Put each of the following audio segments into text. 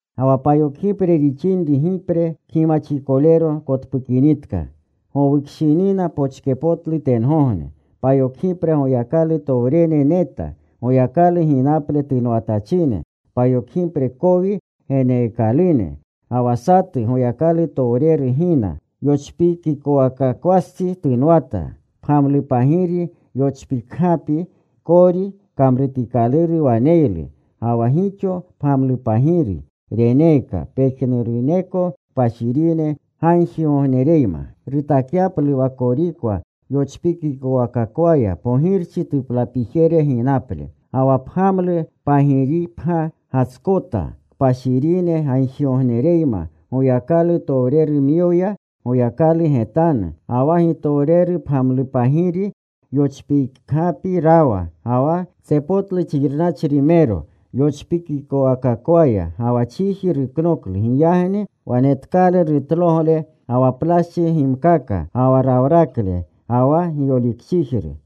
Ga wa payokgipre rixinri gipre kgimaxikolero kotpukinitka, gowukshinina pochkepotlu tengogne. Payokgipre Goyakalutowrene neta, Goyakalu ginaple tunwatachine. Payokgipre kowi geneekalune. Ga wa satu Goyakalutowreru gina. Yochpikikowakakwastsi tunwata. Pgamlupagiri yochpikgapi kori kamrutikaluru waneylu. Ga wa gixo pgamlupagiri reneeka, pejnuruneko kpashirine gagjigognereyma rutakyaplu wa korikwa yochpikikowakakwaya pogirchi tuplapijere ginaple. Ga wa pgamlu pagiripgya gatskota kpashirine gagjigognereyma Goyakalutowrerumyoya Goyakalu getanu. Ga wa gitowrerupgamlupagiri yochpikgapi rawa. Ga wa tsepotlu xirnachrimero yochpikikowakakwaya. Ga wa chiji ruknoklu. Giyagni wanetkalu rutlogle, ga wa plaschi gimkaka, ga wa rawrakle, ga wa giyolikchijru.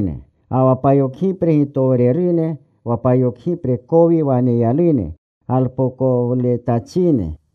Ga wa payokgipre gitowrerune, wa payokgipre kowi waneyalune galpookowletachine.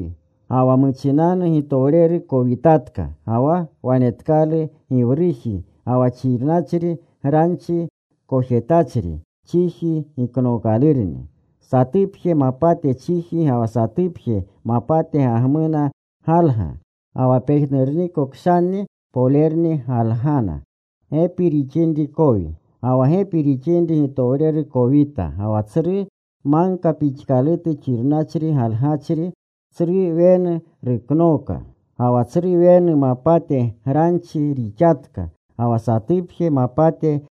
Ga wa muchinanu gitowreru kowitatka. Ga wa wanetkalu giwruji ga wa xirnachri, granchi kojetachri. Chiji giknookalurni. Satupje mapate chiji ga wa satupje mapate gagmuna galga. Ga wa pejnurniko kshanni polerni galgana. Ga wa gepi rixinri gitowreru kowita. Ga wa tsru magka pixkalutu xirnachri galgachri, tsru wenu ruknooka. Ga wa tsru wenu mapate granchi rixatka. Ga wa satupje mapate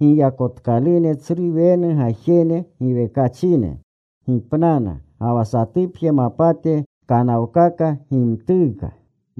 giyakotkalune tsru wenu gajene giwekachine gipnana. Ga wa satupje mapate kanawkaka gimtuuka.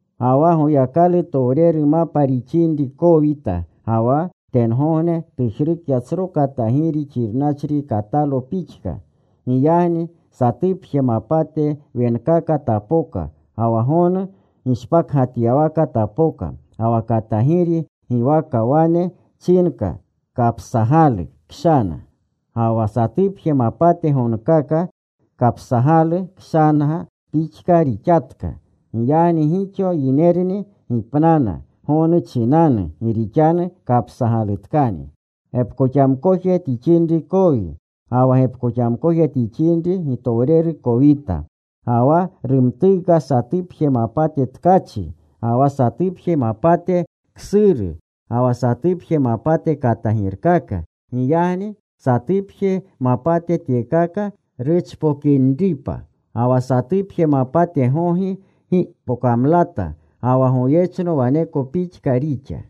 Ga wa Goyakalutowreru mapa rixinri kowita. Ga wa tengogne tujrukya tsro katagiri xirnachri katalo pixka. Giyagni satupje mapate wenkaka tapoka, ga wa gonu gishpakgatyawaka tapoka. Ga wa katagiri giwaka wane chinka kapsagalu kshana. Ga wa satupje mapate gonkaka kapsagalu kshana pixka rixatka. Giyagni gixo yinerni gipnana gonu chinanu gi rixanu kapsagalutkani. Ga wa gepkoxamkoje rixinri gitowreru kowita. Ga wa rumtuuka satupje mapate tkachi, ga wa satupje mapate ksuru, ga wa satupje mapate katagirkaka. Giyagni satupje mapate tyekaka ruchpokinripa. Ga wa satupje mapate gogi gi pokamlata. Ga wa goyechno waneko pixka rixa.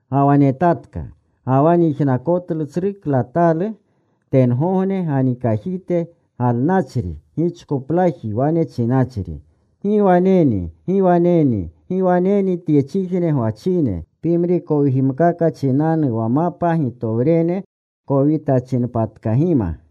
Ga wa netatka. Ga wa nyijnakotlu tsru klatatalu tengogne ganikajite galnachri gichkoplaji wane chinachri, “¡Gi waneni, gi waneni, gi waneni tyechijne gwachine pimri kowigimkaka chinanu wa mapa gitowrene kowitachinpatkagima!”